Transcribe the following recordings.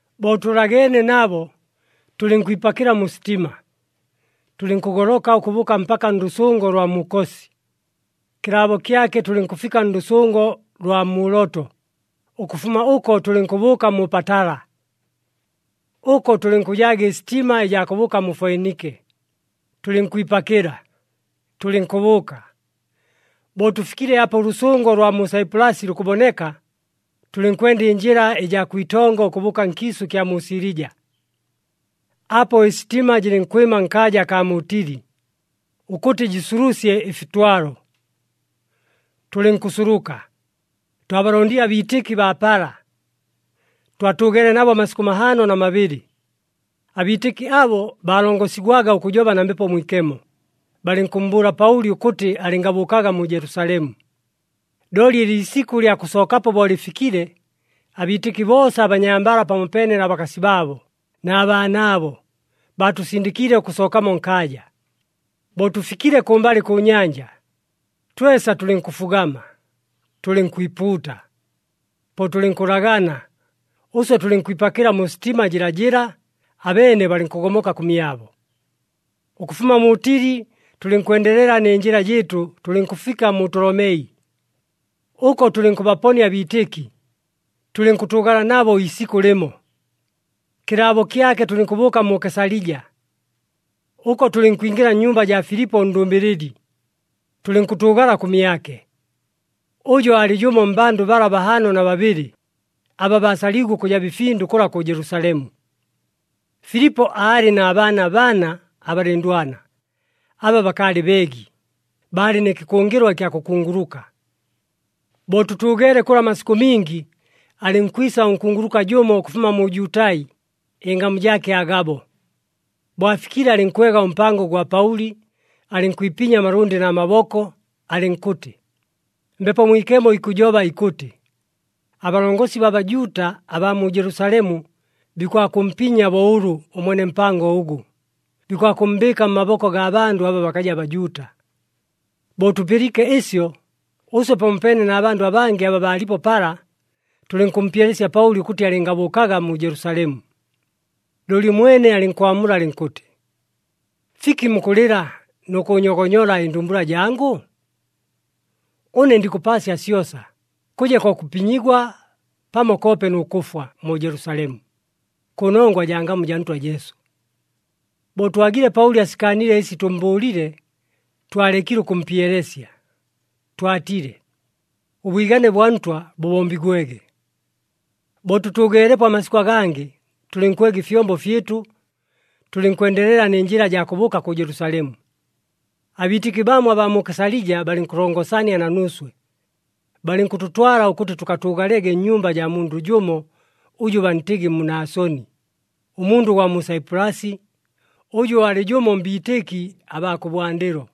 Bo tʉlageene nabo, tʉlɨnkwipakɨla mu sitima, tʉlɨnkʉgoloka ʉkʉbʉʉka mpaka ndʉsʉngo lwa mu Kosi. Kɨlaabo kyake tʉlɨnkʉfika ndʉsʉngo lwa mu Loto, ʉkʉfuma ʉko tʉlɨnkʉbʉʉka mu Patala. Ʉko tʉlɨnkʉjaaga ɨsitima ɨjaa kʉbʉʉka mu Foinike, tʉlɨnkwipakɨla, tʉlɨnkʉbʉʉka. Bo tʉfikile apa ʉlʉsʉngo lwa mu Saipulasi lukʉboneka, tʉlɨnkwenda ɨnjɨla ɨjaa kwitongo ʉkʉbʉʉka nkiisʉ ɨkya mu Silija. Apo ɨsitima jɨlɨnkwɨma nkaaja akaa mu Tili, ʉkʉtɨ jɨsulusye ɨfitwalo. Tʉlɨnkʉsuluka, twabalondile abiitɨki baa pala. Twatʉʉgeele nabo amasikʉ mahaano na mabɨlɨ. Abiitɨki abo baalongosigwaga ʉkʉjoba na Mbepo Mwikemo, balɨnkʉmmbʉʉla Paʉli ʉkʉtɨ alɨngabʉʉkaga mu Jelusalemu. Looli ɨliisikʉ lya kʉsookapo bo lɨfikile, abiitɨki boosa abanyambala pamopeene na bakasi baabo, na baanaabo, baatʉsindɨkiile ʉkʉsookamo nkaaja. Bo tʉfikile kʉmbalɨ kʉ nyanja, twesa tʉlɨnkʉfugama, tʉlɨnkwipuuta. Po tʉlɨnkʉlagana, ʉswe tʉlɨnkwipakɨla mu sitima jɨlajɨla, abeene balɨnkʉgomoka kʉmyabo. Ʉkʉfuma mu Tili, tʉlɨnkwendelela nɨ njɨla jɨɨtʉ, tʉlɨnkʉfika mu Tolomei. Ʉko tʉlɨnkʉbaponia abiitɨki, tʉlɨnkʉtʉʉgala nabo iisikʉ lɨmo. Kɨlaabo kyake tʉlɨnkʉbʉʉka mu Kesalija. Ʉko tʉlɨnkwingɨla nnyumba jaa Filipo ʉndʉmbɨlɨli, tʉlɨnkʉtʉʉgala kʉmyake. Ʉjo aalɨ jʉmo mmbandʉ bala bahaano na babɨlɨ, aba baasaliigwe ʉkʉjaba ɨfindʉ kʉla kʉ Jelusalemu. Filipo aalɨ na baana bana abalɨndwana, aba bakaalɨ beegi, baalɨ nɨ kɨkʉngɨlwa ɨkya kʉkunguluka. Bo tʉtʉʉgeele kʉla amasikʉ mingi, alɨnkwisa ʉnkunguluka jʉmo ʉkʉfuma mu Jutai, ɨngamu jaake Agabo. Bo afikile, alɨnkwega ʉmpango gwa Paʉli, alɨnkwipinya amalʉndɨ na maboko alɨnkʉtɨ, “Mbepo Mwikemo ikʉjoba ikʉtɨ, ‘Abalongosi baa Bajuuta abaa mu Jelusalemu bikwakʉmpinya bo ʉlʉ, ʉmwene mpango ʉgʉ, bikwakʉmmbɨɨka mmaboko gaa bandʉ aba bakaja Bajuuta.’” Bo tʉpɨliike ɨsyo, ʉswe pamopeene na bandʉ abangɨ aba baalipo pala, tʉlɨnkʉmpyelesya Paʉli ʉkʉtɨ alɨngabʉʉkaga mu Jelusalemu. Looli ʉmwene alɨnkwamula alɨnkʉtɨ, “Fiki mukʉlɨla nʉ kʉʉnyogonyola ɨndumbula jangʉ? Ʉne ndikʉpaasya syosa, kʉje ko kʉpinyigwa pamo koope nʉ kʉfwa mu Jelusalemu, kʉnongwa jaa ngamu jaa Ntwa Jesu.” Bo twagile Paʉli asikaanile ɨsi tʉmmbʉʉlile, twalekile ʉkʉmpyelesya, twatile, “Ʉbwigane bwa Ntwa bʉbombigwege.” Bo tʉtʉʉgeelepo amasikʉ agangɨ, tʉlɨnkwega ɨfyombo fyɨtʉ, tʉlɨnkwendelela nɨ njɨla jaa kʉbʉʉka kʉ Jelusalemu. Abiitɨki bamo abaa mu Kesalija balɨnkʉlongosania na nuuswe. Balɨnkʉtʉtwala ʉkʉtɨ tʉkatʉʉgalege nnyumba jaa mundʉ jʉmo ʉjʉ bantɨgɨ Munasoni, ʉmundʉ gwa mu Saipulasi, ʉjʉ aalɨ jʉmo mbiitɨki abaa kʉbwandɨlo.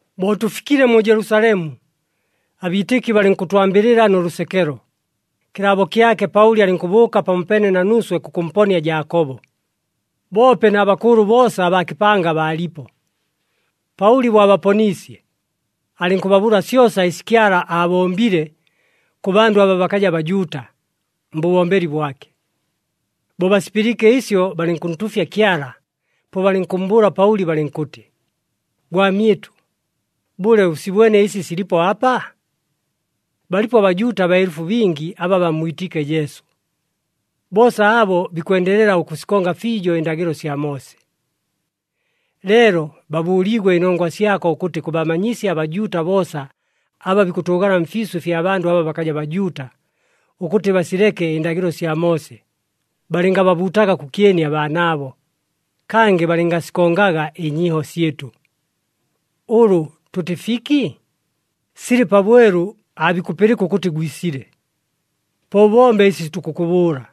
Bo tʉfikile mu Jelusalemu, abiitɨki balɨnkʉtwambɨlɨla nʉ lʉsekelo. Kɨlaabo kyake, Paʉli alɨnkʉbʉʉka pamopeene na nuuswe kʉkʉmponia Jaakobo, boope na bakʉʉlʉ boosa abaa kɨpanga baalipo. Paʉli bo abaponiisye, alɨnkʉbabʉʉla syosa ɨsi Kyala aabombile kʉ bandʉ aba bakaja Bajuuta, mbʉbombeli bwake. Bo basipɨliike ɨsyo, balɨnkʉntuufya Kyala, po balɨnkʉmmbʉʉla Paʉli balɨnkʉtɨ, “Gwamyɨtʉ, bʉle ʉsibwene ɨsi silipo apa? Balipo aBajuuta baelʉfu bingi aba bammwitiike Jesu. Boosa abo bikwendelela ʉkʉsikonga fiijo ɨndagɨlo sya Moose. Leelo baabʉʉliigwe ɨnongwa syako ʉkʉtɨ kʉbamanyisya aBajuuta boosa aba bikʉtʉʉgala mfiisʉ fya bandʉ aba bakaja Bajuuta, ʉkʉtɨ basileke ɨndagɨlo sya Moose, balɨngababuutaga kʉkyeni abaanaabo, kangɨ balɨngasikongaga ɨnyiiho syɨtʉ. Ʉlʉ tʉtɨ fiki? Silɨ pabwelu, aabikʉpɨlɨka ʉkʉtɨ gwisile. Po ʉbombe ɨsi tukʉkʉbʉʉla.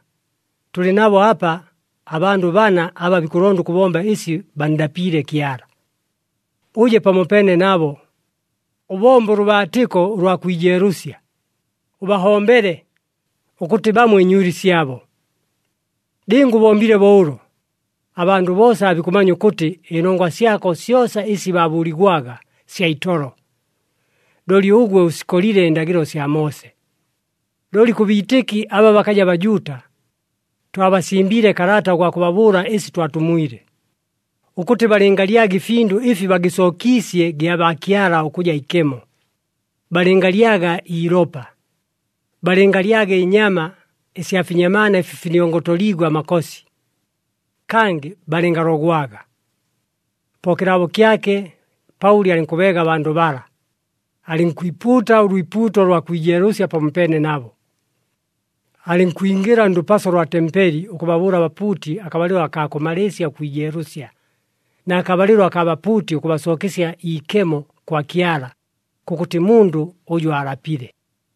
Tʉlɨ nabo apa abandʉ bana aba bikʉlonda ʉkʉbomba ɨsi banndapiile Kyala. Ʉje pamopeene nabo, ʉbombe ʉlʉbaatɨko ʉlwa kwijeelʉsya, ʉbahombele, ʉkʉtɨ bamwe ɨnywili syabo. Lɨnga ʉbombile bo ʉlo, abandʉ boosa aabikʉmanya ʉkʉtɨ ɨnongwa syako syosa ɨsi baabʉʉligwaga sya itolo, looli ʉgwe ʉsikolile ɨndagɨlo sya Moose. Looli kʉ biitɨki aba bakaja Bajuuta, twabasimbiile kalata ʉgwa kʉbabʉʉla ɨsi twatumwile, ʉkʉtɨ balɨngalyaga ɨfindʉ ɨfi bagɨsookiisye gyabaakyala ʉkʉja ikemo, balɨngalyaga iilopa, balɨngalyaga ɨnyama ɨsya finyamaana ɨfi finiongotoliigwe amakosi, kangɨ balɨngalogwaga.” Po kɨlaabo kyake Paʉli alɨnkʉbeega abandʉ bala, alɨnkwipuuta ʉlwipuuto lwa kwijeelʉsya pamopeene nabo. Alɨnkwingɨla ndʉpaso lwa tempeli ʉkʉbabʉʉla abapuuti akabalɨlo akaa kʉmalɨɨsya ʉkwijeelʉsya, na kabalɨlo akaa bapuuti ʉkʉbasookesya iikemo kwa Kyala kʉkʉtɨ mundʉ ʉjʉ aalapile.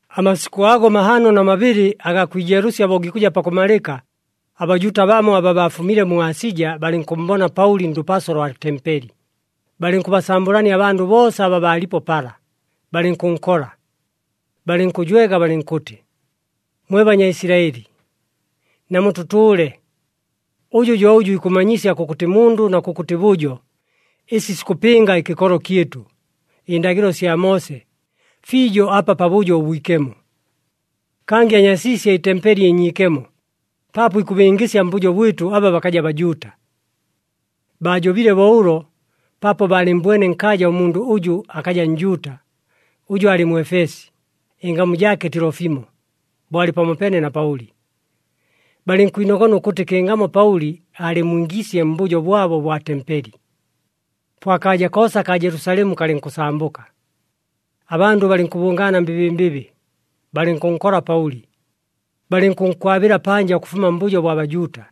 Amasikʉ ago mahaano na mabɨlɨ agaa kwijeelʉsya bo gikʉja pakʉmalɨka, aBajuuta bamo aba baafumile mu Asija balɨnkʉmmbona Paʉli ndʉpaso lwa tempeli, balɨnkʉbasambʉlania abandʉ boosa aba baalipo pala, balɨnkʉnkola. Balɨnkʉjwega balɨnkʉtɨ, “Mwe Banyaisilaɨli, namutʉtʉʉle! Ʉjʉ jo ʉjʉ ikʉmmanyisya kʉkʉtɨ mundʉ na kʉkʉtɨ bʉjo, ɨsi sikʉpɨnga ɨkɨkolo kyɨtʉ, ɨndagɨlo sya Moose, fiijo apa Pabʉjo ʉBwikemo. Kangɨ anyasiisye ɨtempeli ɨnyiikemo paapo ikʉbingɨsya mbʉjo bwɨtʉ aba bakaja Bajuuta.” Baajobile bo ʉlo paapo baalɨmmbwene nkaaja ʉmundʉ ʉjʉ akaja Njuuta, ʉjʉ aalɨ Mwefesi, ɨngamu jaake Tilofimo, bo alɨ pamopeene na Paʉli. Balɨnkwinogona ʉkʉtɨ kɨngamo Paʉli aalɨmmwingiisye mbʉjo bwabo ʉbwa tempeli. Po akaaja koosa kaa Jelusalemu kalɨnkʉsambʉka, abandʉ balɨnkʉbʉngaana mbɨbɨmbɨbɨ, balɨnkʉnkola Paʉli, balɨnkʉnkwabɨla panja ʉkʉfuma mbʉjo bwa Bajuuta.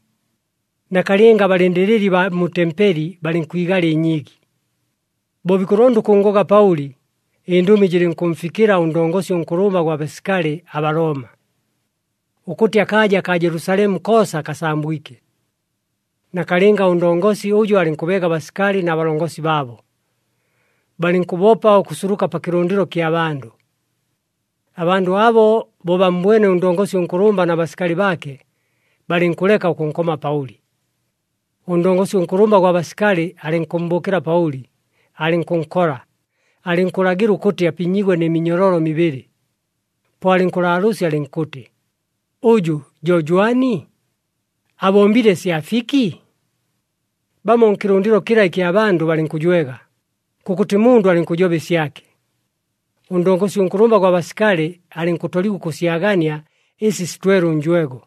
Nakalɨnga abalɨndɨlɨli baa mu tempeli balɨnkwigala ɨnyiigi. Bo bikʉlonda ʉkʉnngoga Paʉli, ɨndʉmi jɨlɨnkʉmfikɨla ʉndongosi ʉnkʉlʉmba gwa basikali aBalooma, ʉkʉtɨ akaaja kaa Jelusalemu koosa kasambwike. Nakalɨnga ʉndongosi ʉjo alɨnkʉbeega abasikali na balongosi baabo, balɨnkʉbopa ʉkʉsuluka pa kɨlʉndɨlo kya bandʉ. Abandʉ abo bo bammbwene ʉndongosi ʉnkʉlʉmba na basikali baake, balɨnkʉleka ʉkʉnkoma Paʉli. Ʉndongosi ʉnkʉlʉmba gwa basikali alɨnkʉmmbʉʉkɨla Paʉli, alɨnkʉnkola, alɨnkʉlagɨla ʉkʉtɨ apinyigwe nɨ minyololo mibɨlɨ. Po alɨnkʉlaalʉʉsya alɨnkʉtɨ, “Ʉjʉ jo jwani? Abombile sya fiki?” Bamo nkɨlʉndɨlo kɨla ɨkya bandʉ balɨnkʉjwega, kʉkʉtɨ mundʉ alɨnkʉjoba ɨsyake. Ʉndongosi ʉnkʉlʉmba gwa basikali alɨnkʉtoligwa ʉkʉsyagania ɨsi sitwele ʉnjwego.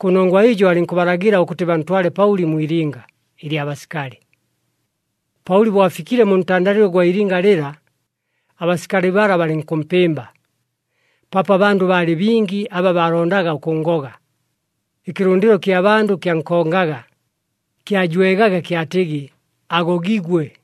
Kʉnongwa ɨjo alɨnkʉbalagɨla ʉkʉtɨ bantwale Paʉli mwi ilinga ɨlya basikali. Paʉli bo afikile mu ntandalɨlo ʉgwa ilinga lɨla, abasikali bala balɨnkʉmpɨmba, paapo abandʉ baalɨ bingi aba baalondaga ʉkʉnngoga. Ɨkɨlʉndɨlo kya bandʉ kyankongaga, kyajwegaga kyatɨgɨ, “Agogigwe!”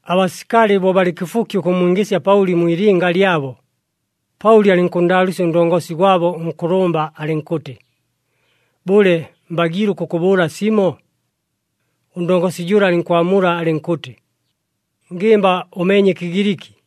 Abasikali bo balɨ kɨfuki ʉkʉmmwingɨsya Paʉli mwi ilinga lyabo, Paʉli alɨnkʉnndaalʉʉsya ʉndongosi gwabo ʉnkʉlʉmba alɨnkʉtɨ, “Bʉle, mbagiile ʉkʉkʉbʉʉla simo?” Ʉndongosi jʉla alɨnkwamula alɨnkʉtɨ, “Ngɨmba ʉmeenye ɨKɨgiliki!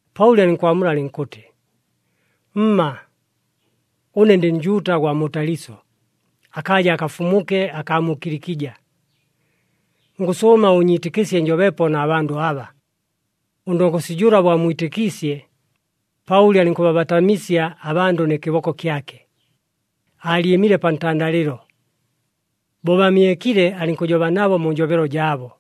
Paʉli alɨnkwamula alɨnkʉtɨ, “Mma! Ʉne ndɨ Njuuta gwa mu Taliso, akaaja akafumuke akaa mu Kilikija. Ngʉsʉʉma ʉʉnyiitɨkɨsye njobepo na bandʉ aba.” Ʉndongosi jʉla bo ammwitɨkiisye, Paʉli alɨnkʉbabatamisya abandʉ nɨ kɨboko kyake, aalyɨmile pa ntandalɨlo. Bo bamyekile, alɨnkʉjoba nabo mu njobelo jaabo.